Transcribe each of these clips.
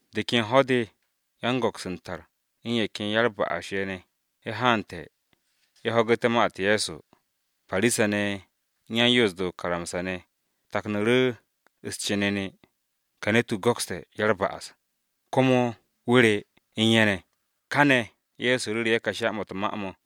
De ken ho̱-de yan-go̱ks u̱n tar, u̱n ye̱ ken ya-u̱r-ba'as ne̱, ye̱ haante̱, ye̱ ho̱gu̱té̱ ma-u̱t Ye̱so. Parisa-ne̱ u̱n yan-Yoos-de o-karamsa ne̱ taknu̱ru̱ u̱s-cenene, “Ka ne̱t-wu̱ go̱kste̱ ya-u̱r-ba'as, komo wu̱ re u̱n ye̱ ne̱!” Kane̱ Ye̱so ru̱ru̱ ye̱ ka sha-mo̱ u̱t-ma mo̱: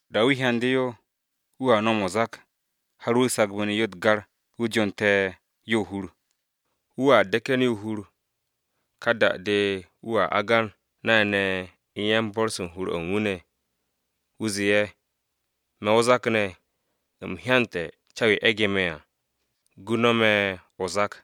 Da-o̱ wu̱ hyande̱ yo, wu̱a no̱m o-zak har wu̱ sagbu̱ne̱ yo u̱t-gar, wu̱ jonte̱ yo o-hur. Wu̱a de̱ke̱n yo o-hur. Ka da-de wu̱ agan nay-ne̱ u̱n yan-bo̱r-se u̱n hur-o̱ u̱n wu̱ ne̱, wu̱ zee ye̱, ‘Me̱ o-zak ne̱, u̱m hyante̱ ca-yo e̱ge̱ me̱ à. Gu no̱ me̱ o-zak!’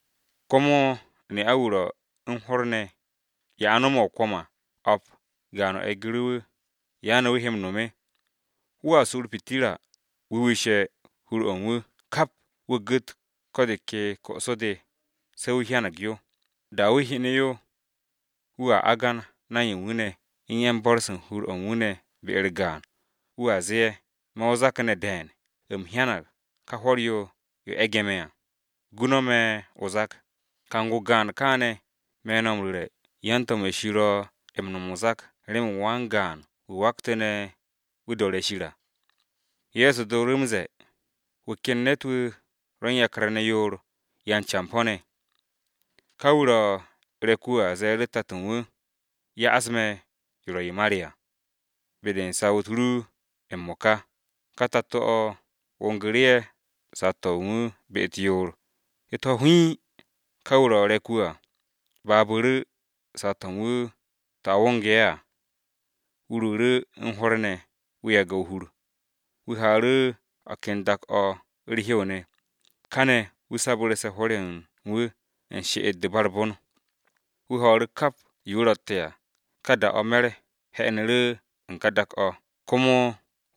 “Ko̱ komo, ne'a-wu̱ ro u̱n hwo̱r ne̱, ye̱ a no̱me̱ o-kwo̱m à o̱p, gaan-o e̱gu̱ru̱ wu̱. ¿Ya ne̱ wu̱ he m-no̱m? Wu̱a su u̱r-pitirra, wu̱ wishe̱ hur-o̱ u̱n wu̱ kap, wu̱ gu̱t ko̱ de ke ko'so-de se̱ wu̱ hyanag yo. Da-o̱ wu̱ hyene̱ yo, wu̱a agan nay u̱n wu̱ ne̱, u̱n yan-bo̱r-se u̱n hur-o̱ u̱n wu̱ ne̱ be-u̱r gaan, wu̱a zee ye̱, ‘Me̱ o-zak ne̱ de̱e̱n, u̱m hyanag ka hwo̱r-yo, yo e̱ge̱ me̱ à. Gu no̱ me̱ o-zak!’ Kang-o gaan kane̱, me̱ no̱ m-ru̱re̱, yan-to̱m-ye̱ Shir ro̱ m-no̱m o-zak remen wan-gaan-wu̱ waktu̱ne̱ wu̱ do̱re̱ Shir à.” Ye̱so dooru̱ m-ze̱e̱, “Wu̱ ken ne̱t-wu̱ ro̱ u̱n yakar ne̱ yoor, yan-campo̱-ne̱. Ka wu̱ ro̱ re̱k-wu̱ à ze̱e̱ru̱ tato u̱n wu̱, ‘Ya'as me̱ yo ro̱ yo ma re à, be-de u̱n saw-u̱t ru m-mo̱ka.’ Ka tato-o wongu̱ru̱ ye̱ saw-to̱ u̱n wu̱ be-u̱t yoor. U̱t-ho̱ hiin, ka wu̱ ro̱ re̱k-wu̱ à babu̱ru̱ saw-to̱ u̱n wu̱ to̱ a wonge̱ ye̱ à. Wu̱ ruuru̱ u̱n hwo̱r ne̱ wu̱ yage̱ o-hur. Wu̱ haaru̱ o̱ ken dak-o̱ u̱r-hew ne̱, kane̱ wu̱ sabu̱rse̱ hwo̱r-ye̱ u̱n wu̱, u̱n she'et-de ba u̱r-bon. Wu̱ ho̱o̱ru̱ kap yo wu̱ ro̱tte̱ à. Ka da-o̱ me̱r 'henu̱ru̱ u̱n ka dak-o̱, komo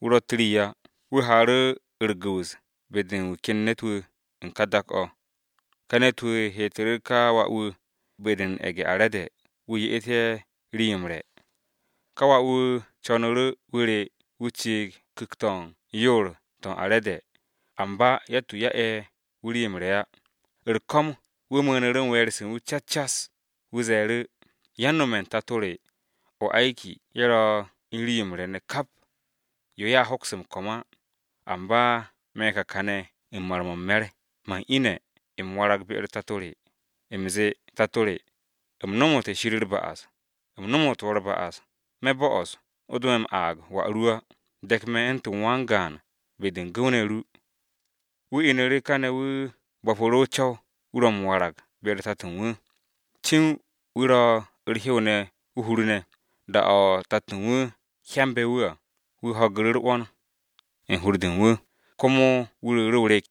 wu̱ ro̱tt rii á. Wu̱ haaru̱ u̱r-gu̱wu̱s be-de u̱n wu̱ ken ne̱t-wu̱ u̱n ka dak-o̱. Ka ne̱t-wu̱ heetu̱ru̱ ka wà-wu̱ be-de u̱n ye̱ge̱-are̱de wu̱ ye'et ye̱ rii-yo m-re̱. Ka wà-wu̱ co̱nu̱ru̱ wu̱ re wu̱ ciig u̱n ku̱k-to̱ u̱n yoor-to̱ u̱n are̱de, amba yatt-wu̱ ya'e̱ wu̱ rii-yo m-re̱ á. U̱r-ko̱m, wu̱ mu̱u̱nu̱ru̱ u̱n we̱e̱r-se u̱n wu̱ cas cas. Wu̱ ze̱e̱ru̱, ‘Yan-no̱me̱ u̱n tato re m-se̱nge̱, ye̱ ro̱ u̱n rii-yo m-re̱ ne̱ kap, yo ye̱a hoks m-ko̱m á, amba me̱ ka kane̱ u̱n mar-mo̱ u̱n me̱r! Man ine̱ m-warag be-u̱r tato re, u̱m zee, “Tato re, u̱m nomote̱ Shir u̱r-ba'as, u̱m nomo wo̱ u̱r-ba'as. Me̱ bo'os o do me̱ m-aag wà ru á, de̱k me̱ u̱ntu̱n wan-gaan be-de u̱n gu̱w-ne̱ ru.” ’ Wu̱ inu̱ru̱ kane̱ wu̱ bo̱pu̱ru̱ o-co̱w wu̱ ro̱ m-warag be-u̱r tato u̱n wu̱. “Cin wu̱ ro̱ u̱r-hew ne̱ o-hur ne̱, da-o̱ tato u̱n wu̱ hyambe̱ wu̱ à, wu̱ ho̱gu̱ru̱ u̱r-'wo̱n u̱n hur-de u̱n wu̱, komo wu̱ ruuru̱ o-rek,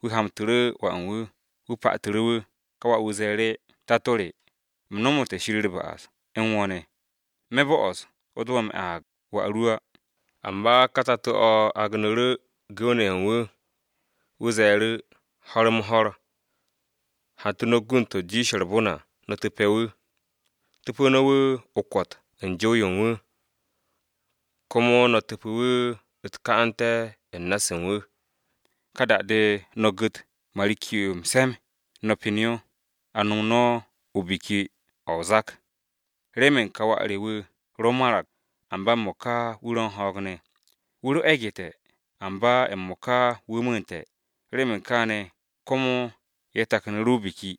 wu̱ hamtu̱ru̱ wà u̱n wu̱, wu̱ patu̱ru̱ wu̱. Ka wà-wu̱ ze̱e̱ru̱, ‘Tato re, u̱m nomote̱ Shir u̱r-ba'as, u̱n wo̱ ne̱. Me̱ bo'os o do me̱ m-aag wà ru á!’ Amba ka tato-o̱ agnu̱ru̱ gu̱w-ne̱ ye̱ u̱n wu̱. Wu̱ ze̱e̱ru̱, ‘Ho̱r-m-ho̱r! Hantu̱ no̱ gund-to̱ jiishe̱ u̱r-bon à no̱ tu̱pe̱ wu̱. Tu̱pu̱ no̱ wu̱ o-kwo̱t u̱n jow-yo u̱n wu̱, komo no̱ tu̱pe̱ wu̱ u̱t-ka'ante̱ u̱n na-se u̱n wu̱. Ka da-de no̱ gu̱t marikki-yo m-se̱m, no̱ pen yo, a nom no̱ biki-o̱ o-zak! Remen ka wà re wu̱ ro marag, amba m-mo̱ka wu̱ ro̱ u̱n ho̱o̱g ne̱. Wu̱ ro e̱gu̱te̱, amba m-mo̱ka wu̱ mu̱u̱nte̱.’ Remen kaane̱ komo ye̱ taknu̱ru̱ o-biki.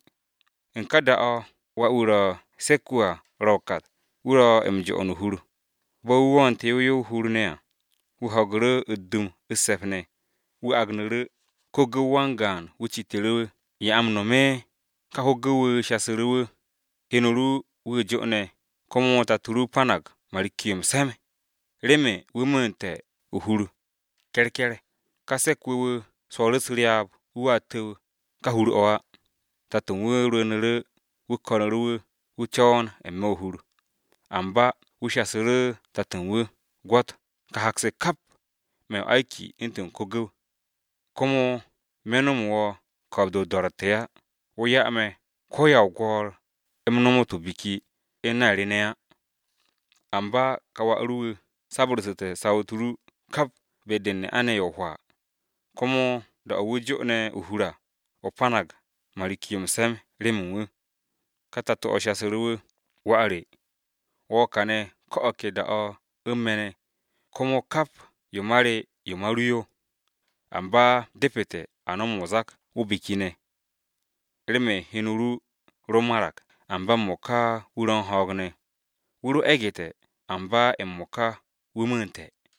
“U̱n ka da-o̱ Wà-wu̱ ro se̱k-wu̱ à ro o-kat. Wu̱ ro̱ m-jo'on o-hur, bo̱ wu̱ wo̱o̱nte̱ yow yow o-hur ne̱ à, wu̱ ho̱gu̱ru̱ u̱t-dum u̱s-se̱p ne̱. Wu̱ agnu̱ru̱ ko-gu̱w wan-gaan wu̱ citu̱ru̱ wu̱, ‘¿Ya a m-no̱m?’ Ka ko-gu̱w-wu̱ shasu̱ru̱ wu̱, ‘Heno ru wu̱ jo'one̱, komo tato ru panag marikki-yo m-se̱m, remen wu̱ mu̱u̱nte̱ o-hur ke̱rke̱r.’ “Ka se̱k-wu̱ wu̱ swo̱o̱ru̱ u̱s-ryaab, wu̱a tu̱w ka hur-o̱ á. Tato u̱n wu̱ rwu̱u̱nu̱ru̱ wu̱ ko̱nu̱ru̱ wu̱, wu̱ co̱wo̱n n-me̱ o-hur. Amba wu̱ shasu̱ru̱ tato u̱n wu̱, ‘Gwo̱t, ka hak-se kap, me̱ m-se̱nge̱ u̱ntu̱n ko-gu̱w, komo me̱ nomo wo̱ ko̱o̱b-de o-do̱ro̱tte̱ á. Wo̱ 'ya me̱ ko ya o-gwo̱o̱r u̱m nomot o-biki u̱n nay re ne̱ á. Amba ka wà ru wu̱ sabu̱rsu̱te̱ saw-u̱t ru kap be-de u̱n ne'a-ne̱ ye̱ hwaa, komo da-o̱ wu̱ jo'one̱ o-hur à, o panag marikki-yo m-se̱m remen wu̱!’ Ka tato-o̱ shasu̱ru̱ wu̱, ‘Wà re, wo̱ kane̱ ko̱ o̱ ke da-o̱ u̱n me̱ ne̱, komo kap yo ma re yo ma ru yo. Amba depete̱ a no̱m o-zak o-biki ne̱, remen heno ru ro marag, amba m-mo̱ka wu̱ ro̱ u̱n ho̱o̱g ne̱, wu̱ ro e̱gu̱te̱, amba m-mo̱ka wu̱ mu̱u̱nte̱.’”